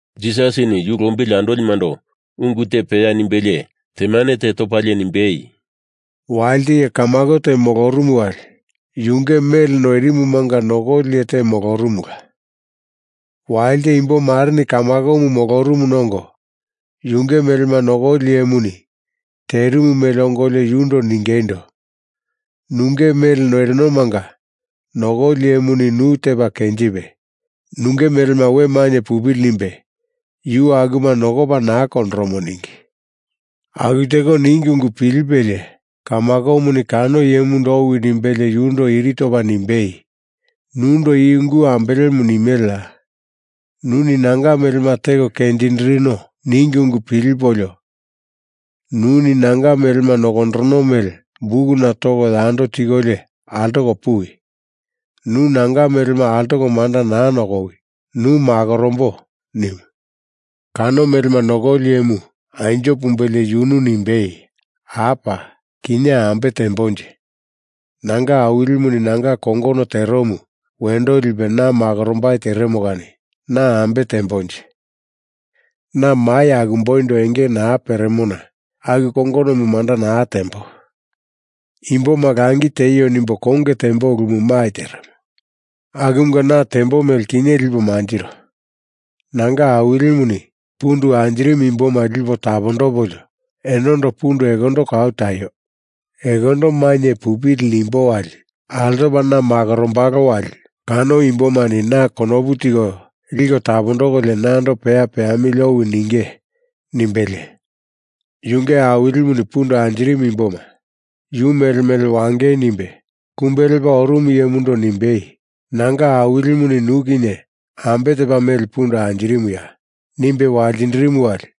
Jisasini yu lombili andolimando ungu te peya nimbelie temane te topalie nimbei, “Walite iye kamako te molorumu wali yunge mele noirimumanga nokoli iye te molorumula. Walite imbo mareni kamakomu molorumuna ongo, yunge melema nokoli iyemuni terimu mele ongolio yundo ningeindo, ‘Nunge mele noirinomanga nokoli iyemuni nu tepa kenjipe, nunge melema we mainye pupili nimbe yu akuma nokopa naa kondoromo,’ ningi. Aku teko ningi ungu pilipelie kamakomuni kano iyemundo owi nimbelie yundo iri topa nimbei, ‘Nundo i ungu ambelemu nimeleya? Nuni nanga melema teko kenjindirino ningi ungu pilipolio nuni nanga melema nokondoromo mele bukuna toko, yando tikolio altoko puwi. Nu nanga melema altoko manda naa nokowi, nu makorombo,’ nimu. Kano melema nokoli iyemu anjo pumbelie yunu nimbei, ‘Apa! Kinye ambe teambonje? Nanga awilimuni nanga kongono teromu wendo lipe na makorombai teremo kani na ambe teambonje? Na mai akumboindo enge naa peremo na aku kongonomu manda naa tembo. Imboma langi tieio nimbo konge tembo ulumu mai teremo. Akumunga na tembo mele kinye lipo manjiro. Nanga awilimuni pundu anjirimu imboma lipo tapondopolio enondo pundu ekondo kau taio, ekondo mainye pupili nimbo wali altopa na makorombalo wali kano imbomani na konopu tiko liko tapondokolio nando peya peamili owi ninge,’ nimbelie, yunge awilimuni pundu anjirimu imboma yu mele mele wangei nimbe kumbe lepa orumu iyemundo nimbei ‘Nanga awilimuni nu kinye ambe tepa mele pundu anjirimuya?’ nimbe waltindirimu wali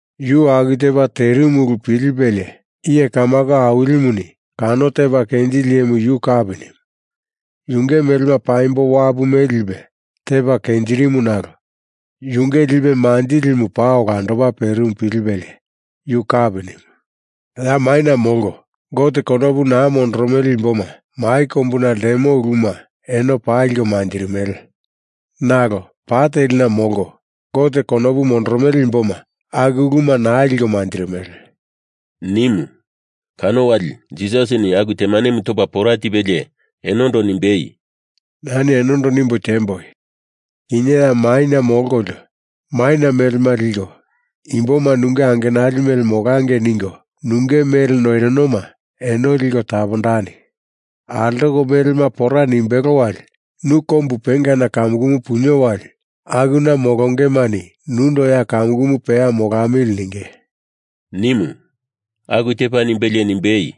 Yu aku tepa terimu ulu pilipelie iye kamako awilimuni kano tepa kenjili iyemu yu kapi nimu. Yunge melema paimbo wapu mele lipe tepa kenjirimu nalo yunge lipe manjilimu paa olandopa perimu pilipelie yu kapi nimu. Ya maina molko, Gote konopu naa mondoromele imboma mai kombuna ltemo uluma eno paa liko manjirimele. Nalo pa telina molko Gote konopu mondoromele imboma aku uluma naa liko manjirimele,” nimu. Kano wali Jisasini aku temanemu topa pora tipelie enondo nimbei, “Nani enondo nimbo tiemboi. Kinye ya maina molkolio maina melema liko imboma nunge angenali mele molangei ningo nunge mele noirinoma eno liko tapondani! Altoko melema pora nimbelo wali nu kombu pengana kamukumu punio wali akuna molongemani nundo ya kamukumu peya molamili ninge,” nimu. Aku tepa nimbelie nimbei,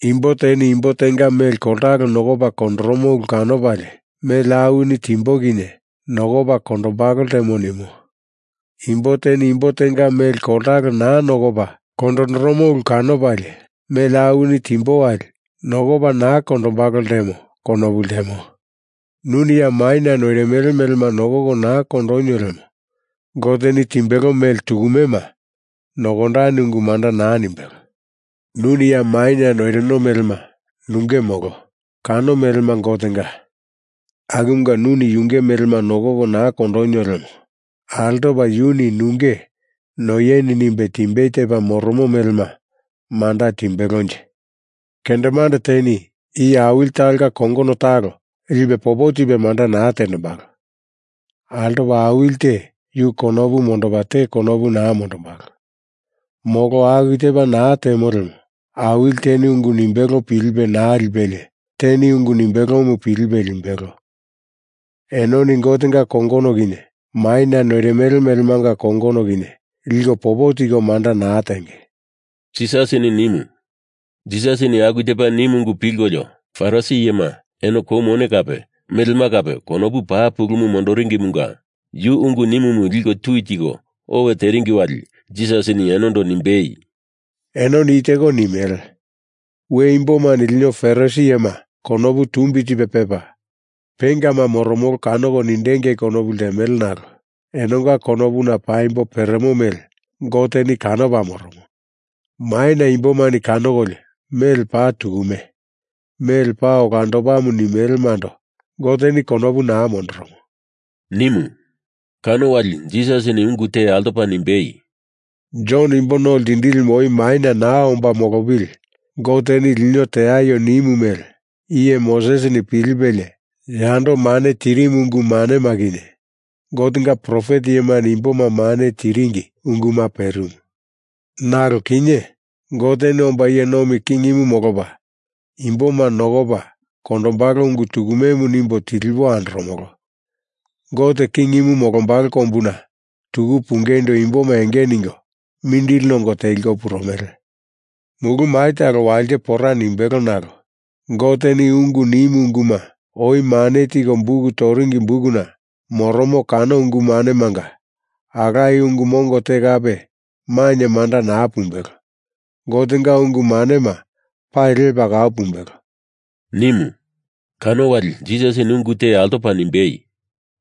“Imbo teni imbo tenga mele koltalo nokopa kondondoromo ulu kanopalie mele awini timbo kinye nokopa kondondombalo ltemo nimo. Imbo teni imbo tenga mele koltalo naa nokopa kondondoromo ulu kanopalie mele awini timbo wali nokopa naa kondondombalo ltemo konopu ltemo. Nuni ya maina noirimele melema nokoko naa kondonio lemo Goteni timbelo mele tukumema, nokondani ungu manda naa nimbelo. Nuni ya maina noirino melema nunge molo, kano melema Gotenga. Akumunga nuni yunge melema nokoko naa kondonio lemo altopa yuni nunge noieni nimbe timbei tepa moromo melema manda timbelonje? Kendemande teni iye awili talonga kongono talo lipe popo tipe manda naa tendembalo. Altopa awili te yu konopu mondopa te konopu naa mondombalo. Molo aku tepa naa temo lemo awili teni ungu nimbelo pilipe naa lipelie teni ungu nimbelomu pilipe limbelo. Enoni Gotenga kongono kinye maina noirimele melemanga kongono kinye liko popo tiko manda naa tenge,” Jisasini nimu. Jisasini aku tepa nimu ungu pilkolio Farisi iyema eno kou mone kape melema kape konopu paa pulumu mondoringimunga yu ungu nimumu liko tui tiko owe teringi wali Jisasini enondo nimbei, “Enoni i teko nimele. We imbomani lino Farisi iyema konopu tumbi tipe pepa, pengama moromolo kanoko nindengei konopu ltemele nalo enonga konopuna paimbo peremo mele Goteni kanopa moromo. Maina imbomani kanokolio mele paa tukume, mele paa olandopamu nimelemando Goteni konopu naa mondoromo,” nimu. Kano wali Jisasini ungu te altopa nimbei, “Jon Imbo No Ltindilimu oi maina naa omba molopili Goteni lino teaio nimu mele iye Mosesini pilipelie yando mane tirimu ungu manema kinye, Gotenga profet iyemani imboma mane tiringi unguma perimu. Nalo kinye, Goteni omba iye nomi kingimu molopa imboma nokopa kondombalo ungu tukumemu nimbo tilipo andoromolo. Gote kingimu molombalo kombuna tuku pungeindo imboma enge ningo mindili nongo teliko purumele. Mulu mai talo walite pora nimbelo nalo Goteni ungu nimu unguma oi mane tiko buk toringi bukuna moromo kano ungu manemanga alaye ungu mongo te kape mainye manda naa pumbelo. Gotenga ungu manema pali lepa kau pumbelo,” nimu. Kano wali Jisasini ungu te altopa nimbei,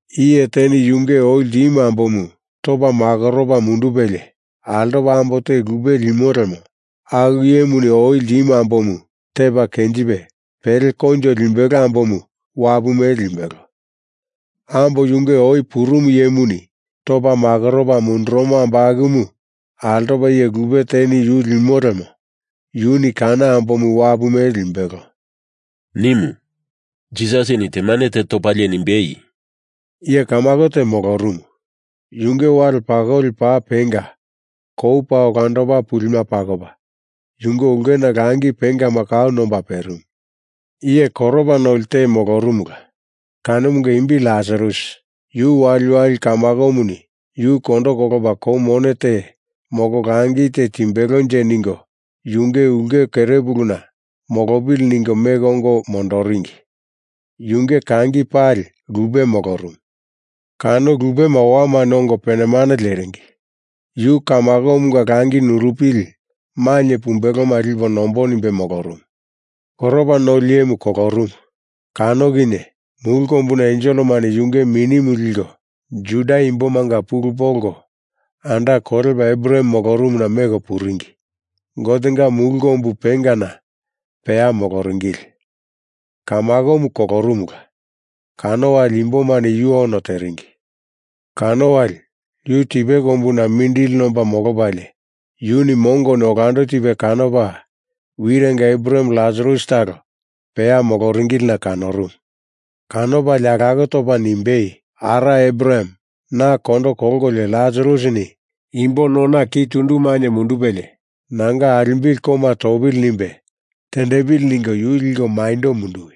“Iye teni yunge oi ltimu ambomu topa makoropa mundupelie altopa ambo te lupe limo lemo aku iyemuni oi ltimu ambomu tepa kenjipe pele koinjo limbelo ambomu wapu mele limbelo. Ambo yunge oi purumu iyemuni topa makoropa mundurumo ambo akumu altopa iye lupe teni yu limo lemo yuni kano ambomu wapu mele limbelo,” nimu. Jisasini temane te topalie nimbei, “Iye kamako te molorumu. Yunge wale pakoli paa penga kou paa olandopa pulima pakopa, yunge ulkena langi pengama kau nomba perimu. Iye koropa noli te molorumula, kanomunga imbi Lasarus. Yu waliwali kamakomuni yu kondo kolopa kou mone te molo langi te timbelonje ningo yunge ulke kerepuluna molopili ningo meko ongo mondoringi. Yunge kangi pali lupe molorumu. Kano lupema owamani ongo penemane leringi. Yu kamakomunga langi nurupili mainye pumbeloma lipo nombo nimbe molorumu. Koropa noli iyemu kolorumu, kano kinye mulu kombuna enselemani yunge minimu liko, Juda Imbomanga pulu polko anda kolepa Abraham molorumuna meko puringi, Gotenga mulu kombu pengana peya moloringili. Kamakomu kolorumula, kano wali imbomani yu ono teringi. Kano wali yu tipe kombuna mindili nomba molopalie, yuni mongoni olando tipe kanopa wirenga Abraham Lasarus talo peya moloringilina kanorumu. Kanopalie alako topa nimbei, ‘Ara Abraham, na kondo kolkolio Lasarusini imbo nona ki tundu mainye mundupelie nanga alimbili koma topili nimbe tendepili ningo yu liko maindo munduwi.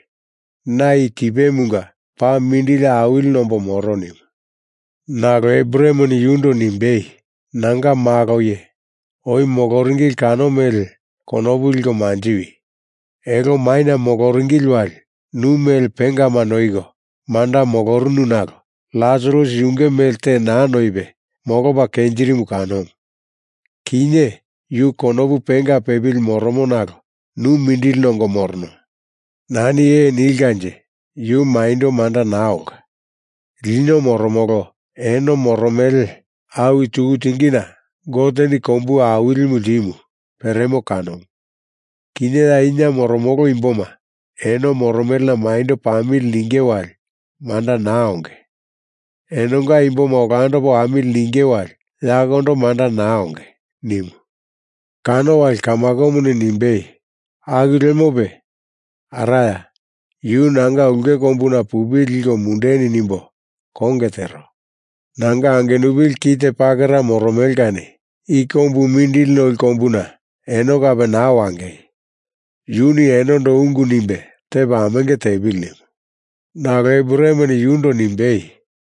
Na i tipemunga paa mindili awili nombo moro,’ nimu. Nalo Abrahameni yundo nimbei, ‘Nanga malo iye, oi moloringili kano mele konopu liko manjiwi! Elo maina moloringili wali nu mele pengama noiko manda molorunu nalo Lasarus yunge mele te naa noipe molopa kenjirimu kanomu. Kinye yu konopu penga pepili moromo nalo nu mindili nongo morono. Nani ee nilkanje yu maindo manda naa olka. Lino moromolo eno moromele awi tuku tingina Goteni kombu awilimu ltimu peremo kanomu. Kinye ya ina moromolo imboma eno moromelena maindo pamili ninge wali manda naa onge; enonga imboma olando wamili ninge wali yakondo manda naa onge,’ nimu. Kano wali kamakomuni nimbei, ‘Aku lemope Araya, yu nanga ulke kombuna pupili liko mundeni nimbo konge tero. Nanga angenupili ki te pakera moromele kani. I kombu mindili noli kombuna eno kape naa wangei, yuni enondo ungu nimbe tepa amenge tepili,’ nimu. Nalo Abrahameni yundo nimbei,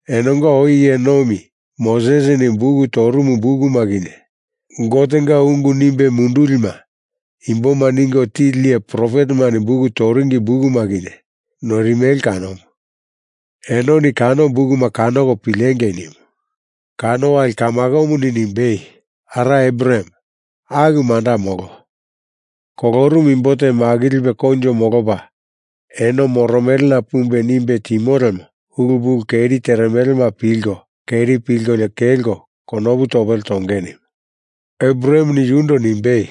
‘Enonga oi iye nomi Mosesini buk torumu bukuma kinye Gotenga ungu nimbe mundulima imboma ningo tili iye profetemani buk toringi bukuma kinye noirimele kanomu. Enoni kano bukuma kanoko pilengei,’ nimu. Kano wali kamakomuni nimbei, ‘Ara Abraham, aku manda molo. Kolorumu imbo te makilipe koinjo molopa eno moromelena pumbe nimbe timo lemo ulu pulu keri teremelema pilko keri pilkolio kelko konopu topele tonge,’ nimu. Abrahameni yundo nimbe,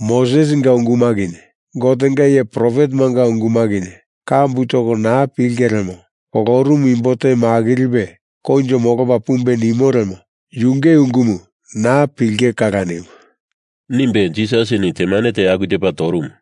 ‘Mosesinga unguma kinye Gotenga iye profetemanga unguma kinye kambu toko naa pilinge lemo kolorumu imbo te makilipe koinjo molopa pumbe nimo lemo yunge ungumu naa pilinge kala,’ nimu,” nimbe Jisasini temane te aku tepa torumu.